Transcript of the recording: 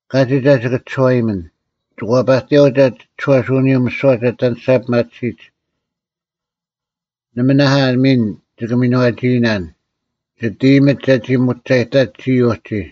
ᑲᒋᒡ ᐊ ᒋᑭ ᒋᔄᐃᒥᓇᓐ? ᒋᑭ ᐛᐸᑎᔭᐅᒡ ᐊ ᒋᒋᔄᓯᐅᓂᔪᐤ ᒥᓯᐛ ᒐ ᐊᑎ ᐊᓂᔅᒐ ᐱᒪᑎᓯᒡ? ᓇᒪ ᐊ ᒥᓐ ᒋᑭ ᒥᓏᒋᐃᓇᓐ; ᒋᑦ ᐃᔨᒥᒡ ᒐᒋ ᒧᒐᔨᑕᒡ ᒋᔾ ᐅᒋ?